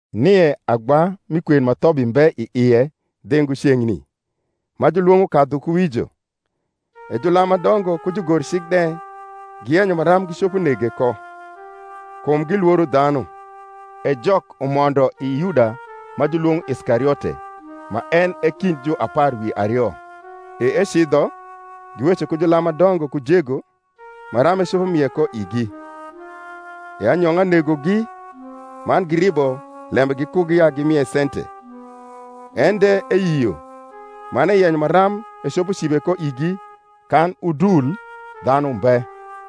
NIE agba mi kwen ma thobi mbe i ie dhingo ceng’ni, ma julwong’o Kadhukuwijo. E julam ma dongo ku jugorcik de giyenyo maram gicopo nege ko; kum gilworo dhanu. E Jok umondo i Yuda ma julwong’o Iskariote, ma en e kind juapar wi ario. E ecidho, giweco ku julam ma dongo ku jego, maram ecopo mie ko igi. E anyong’a negogi, man giribo lembe gikugi ya gimie sente. En de eyio, man eyenyo maram ecopo cibe ko igi kan udul dhanu mbe.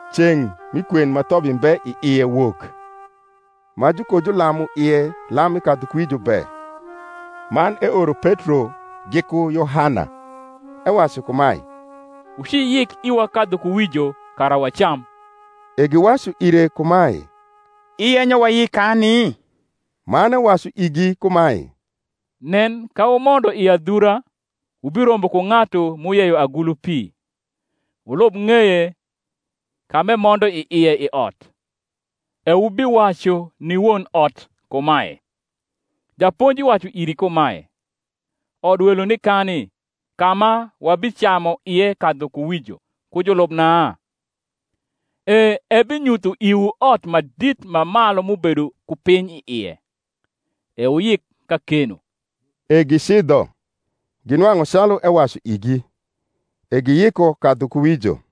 Ceng’ mi kwen ma thobi mbe i ie wok, ma jukojulamu ie lam mi kadhukuwijo be. Man eoro Petro giku Yohana, ewacu kumae, Wuciyik iwa kadhukuwijo, kara wacam. E giwacu ire kumae, Iyenyo wayik kani? Man ewacu igi kumae, Nen, ka wumondo i adhura, wubirombo ku ng’atu m’uyeyo agulu pi; wulub ng’eye ka m’emondo i ie i ot. E wubiwacu ni won ot kumae, Japonji wacu iri kumae, Odwelo nikani, ka ma wabicamu ie kadhukuwijo ku julubna? E ebinyutho iwu ot ma dit ma malu m’ubedo ku piny i ie: e wuyik kakeno. E gicidho, ginwang’u calu ewacu igi: e giyiko kadhukuwijo.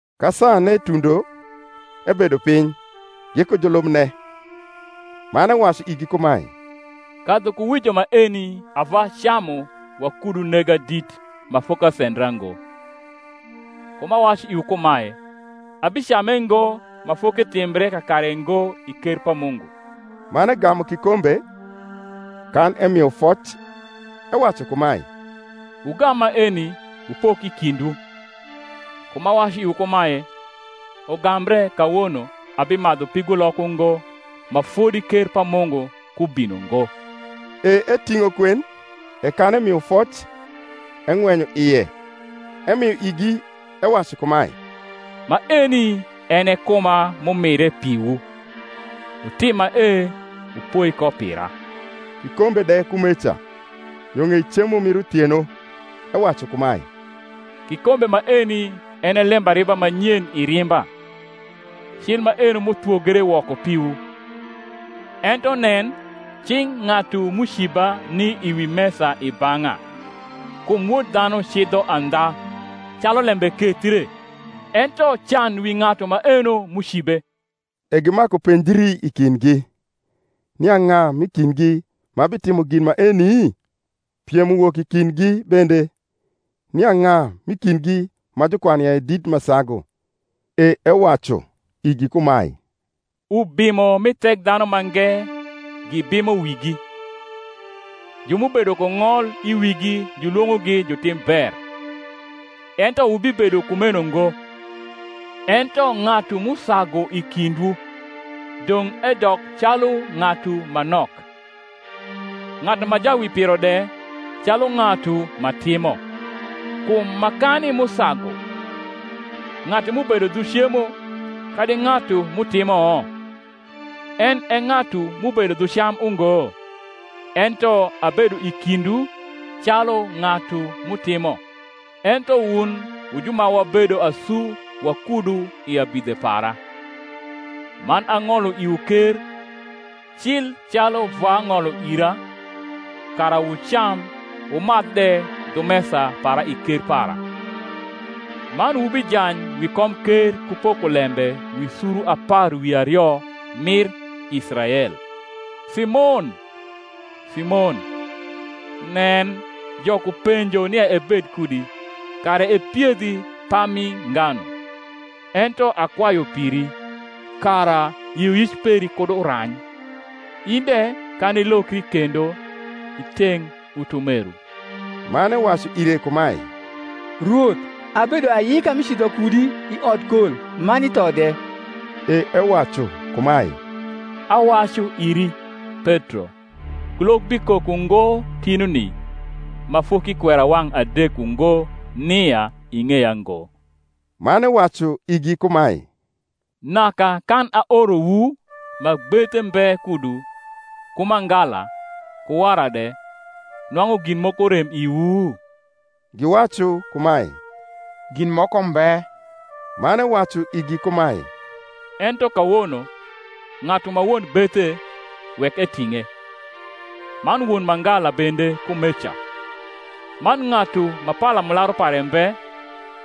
Ka saane tundo, ebedo piny, giku julubne. Man ewacu igi kumae, Kadhukuwijo maeni ava camu wakudu nega dit ma fokasendra ngo: kum awacu iwu kumae, Abicame ngo, ma foketimbre kakare ngo i ker pa Mungu. Man egamu kikombe, kan emio foc, ewacu kumae, Wugam maeni, wupok i kindwu: kum awacu iwu kumae, Ugambre kawono abimadhu pigolok ungo, ma fodi ker pa Mungu ku bino ngo. E eting’o kwen, e kan emio foc, eng’wenyo ie, emio igi, ewacu kumae, Maeni en e kuma m’umire piwu: wutim mae wupoi ko pira. Kikombe de kumeca yo ng’ei cemo mir uthieno, ewacu kumae, Kikombe maeni en e lembariba ma nyen i rimba, cil maeno m’uthwogre woko piwu. Ento nen, cing’ ng’atu m’uciba ni wi mesa i bang’a. Kum Wod dhanu cidho andha, calu lembe kethre: ento can wi ng’atu maeno m’ucibe! E gimaku penjri i kindgi, nia ng’a m’i kindgi ma bitimo gin maeni? Piem uwok i kindgi bende, nia ng’a m’i kindgi ma jukwanu ya e dit ma sagu. E ewacu igi kumae, Ubimo mi Thekdhanumange gibimo wigi; ju m’ubedo ku ng’ol i wigi julwong’ogi Jutimber. Ento wubibedo kumeno ngo: ento ng’atu m’usagu i kindwu, dong’ edok calu ng’atu ma nok; ng’atu ma jawipiro de, calu ng’atu ma timo. Kum makani m’usagu, ng’atu m’ubedo dhu cemo, kadi ng’atu m’utimo? en e ng’atu m’ubedo dhu cam ungo? ento abedo i kindwu calu ng’atu m’utimo. Ento wun wu ju ma wabedo asu wakudu i abidhe para; man ang’olo iwu ker, cil calu Vwa ng’olo ira, kara wucam wumadh de dhu mesa para i ker para; man wubijany wi komker ku poko lembe wi suru apar wi ario mir Israel. Simon, Simon, nen, Jok upenjo nia ebed kudi, kara epiedhi pami nganu: ento akwayu piri, kara yioyic peri kud urany; in de, kan ilokri kendo, iteng’ utumeru. Man ewacu ire kumae, Rwoth, abedo ayika mi cidho kudi i odkol man i tho de. E ewacu kumae, Awacu iri, Petro, kulok bikok ungo tinuni, ma fok’ikwero wang’ adek ungo nia ing’eya ngo. Man ewacu igi kumae, Naka kan aorowu ma gbethe mbe kudu, ku mangala, ku wara de, nwang’u gin moko rem iwu? Giwacu kumae, Gin moko mbe. Man ewacu igi kumae, Ento kawono, ng’atu ma won gbethe, wek eting’e, man won mangala bende kumeca; man ng’atu ma palamularu pare mbe,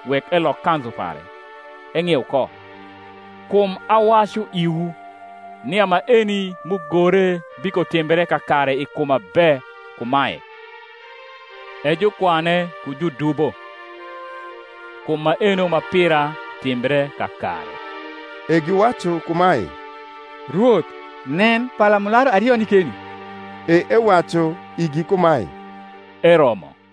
wek elok kanzu pare, eng’ieu ko. Kum awacu iwu, nia maeni m’ugore bikotimbre kakare i kuma be kumae, E jukwane ku judubo: kum maeno ma pira timbre kakare. E giwacu kumae, Rwoth, nen, palamularu ario ni keni. E ewacu igi kumae, Eromo.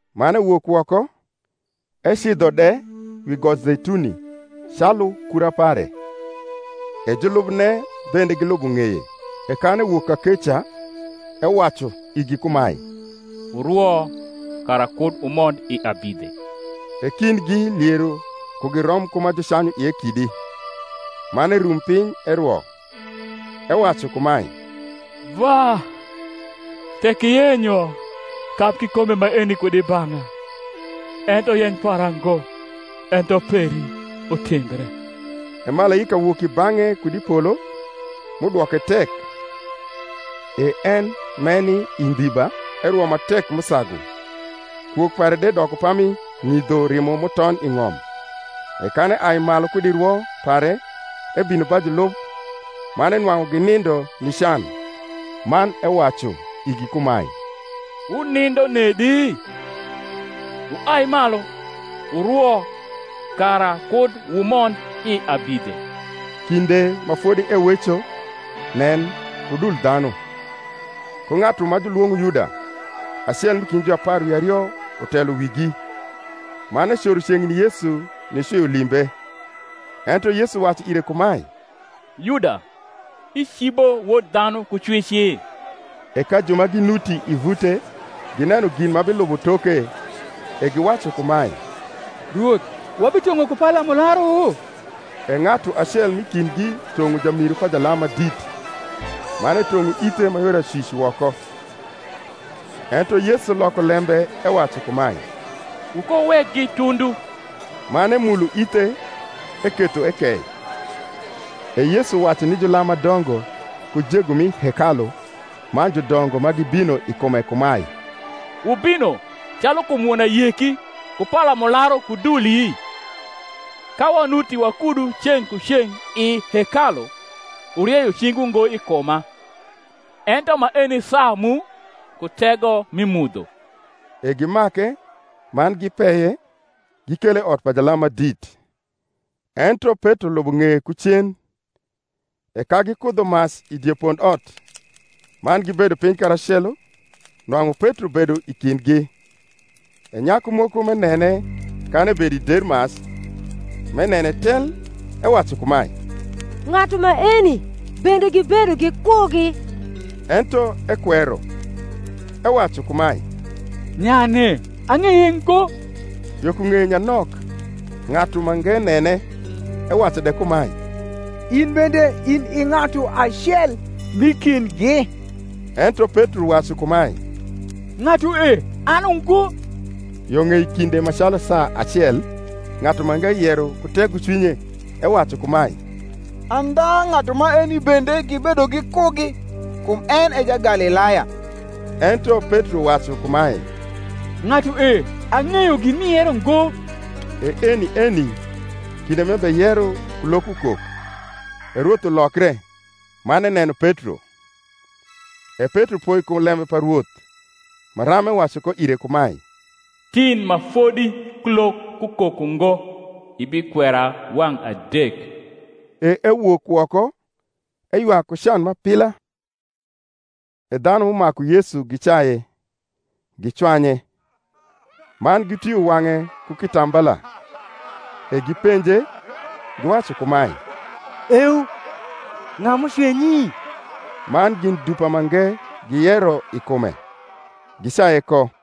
Man ewok woko, ecidho de, wi got Zeituni, calu kura pare; e julubne bende gilubo ng’eye. E kan ewok kakeca, ewacu igi kumae, Wurwo kara kud wumond i abidhe. E kindgi liero kugi rom ku ma jucanyu ie kidi; man erum piny erwo, ewacu kumae, Vwa, tek iyenyo, kab kikombe maeni kud i bang’a: ento yeny para ngo, ento peri, utimbre. E malaika wok i bang’e kud i polo, m’udwoke tek. E en m’eni i ndiba erwo ma tek m’usagu; kwok pare de doko pami ng’idho rimo m’uton i ng’om. E kan eai malu kud i rwo pare, ebino ba julub, man enwang’u ginindo ni can, man ewacu igi kumae, Wunindo nedi? wuai malu, wurwo, kara kud wumond i abidhe. Kinde ma fodi eweco, nen, udul dhanu, ku ng’atu ma julwong’o Yuda, acel m’i kind juapar wi ario utelo wigi; man ecoro ceng’ni Yesu nicwio limbe. Ento Yesu wacu ire kumae, Yuda, icibo Wod dhanu ku cwici? E ka ju ma ginuti i vute gineno gin ma bilubo toke, e giwacu kumae, Rwoth, wabitong’o ku palamularu? E ng’atu acel m’i kindgi tong’o jamiru pa jalam ma dit, man etong’o ithe ma yor acwic woko. Ento Yesu loko lembe ewacu kumae, Wukowuwekgi tundu. Man emulo ithe, eketho ekei. E Yesu wacu ni julam ma dongo, ku jego mi hekalu, man judongo, ma gibino i kume kumae, Wubino, calu kum won ayeki, ku palamularu ku duli? Ka wanuti wakudu ceng’ ku ceng’ i hekalu, wuricyo cingwu ngo i kuma: ento maeni saa mu, ku tego mi mudho. E gimake, man gipeye, gikele i ot pa jalam ma dit. Ento Petro lubo ng’eye ku cen. E ka gikudho mac i die pondot, man gibedo piny karacelo, nwang’u Petro bedo i kindgi. E nyaku moko m’enene kan ebedo i der mac, m’enene tel, ewacu kumae, Ng’atu maeni bende gibedo gikugi. Ento ekwero, ewacu kumae, Nyane, ang’eye ngo. Yo ku ng’eye nyanok ng’atu mange nene, ewacu de kumae, In bende in i ng’atu acel m’i kindgi. Ento Petro wacu kumae, Ng’atue, an ungo. Yo ng’ei kinde ma calu saa acel ng’atu mange yero ku tegocwinye, ewacu kumae, Andha ng’atu maeni bende gibedo gikugi; kum en e Jagalilaya. Ento Petro wacu kumae, Ng’atue, ang’eyo gin m’iyero ngo. E eni eni, kinde m’ebeyero, kulok ukok. E Rwoth ulokre, man eneno Petro. E Petro poi kum lembe pa Rwoth, maram ewacu ko ire kumae, Tin ma fodi kulok kukok ungo ibikwera wang’ adek. E ewok woko, eywak ku can m’apila. E dhanu m’umaku Yesu gicaye, gicwanye. Mau gitwio wang’e ku kita mbala, e gipenje, giwacu kumae, Eu: ng’a m’ucwenyi? Man gin dupa mange giyero i kume, gicaye ko.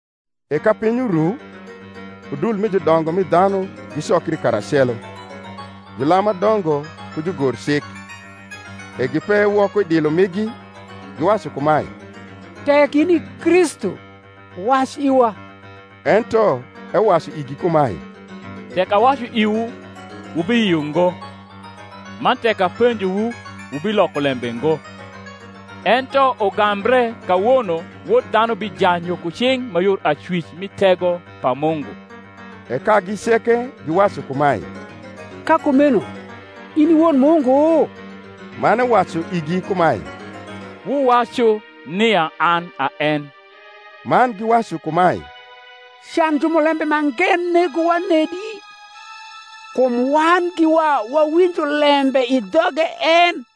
E ka piny uru, udul mi judongo mi dhanu gicokri karacelo, julam ma dongo ku jugorcik; e gipeye woko i dilo migi, giwacu kumae, Tek in i Kristu, wac iwa. Ento ewacu igi kumae, Tek awacu iwu, wubiyio ngo: man tek apenjowu, wubiloko lembe ngo. Ento ugambre kawono Wod dhanu bijany yo ku cing’ ma yor acwic mi tego pa Mungu. E kagi ceke giwacu kumae, Ka kumeno in i Wod Mungu? Man ewacu igi kumae, Wuwacu nia an a en. Man giwacu kumae, Can jumulembe mange negowa nedi? kum wan giwa wawinjo lembe i dhoge en.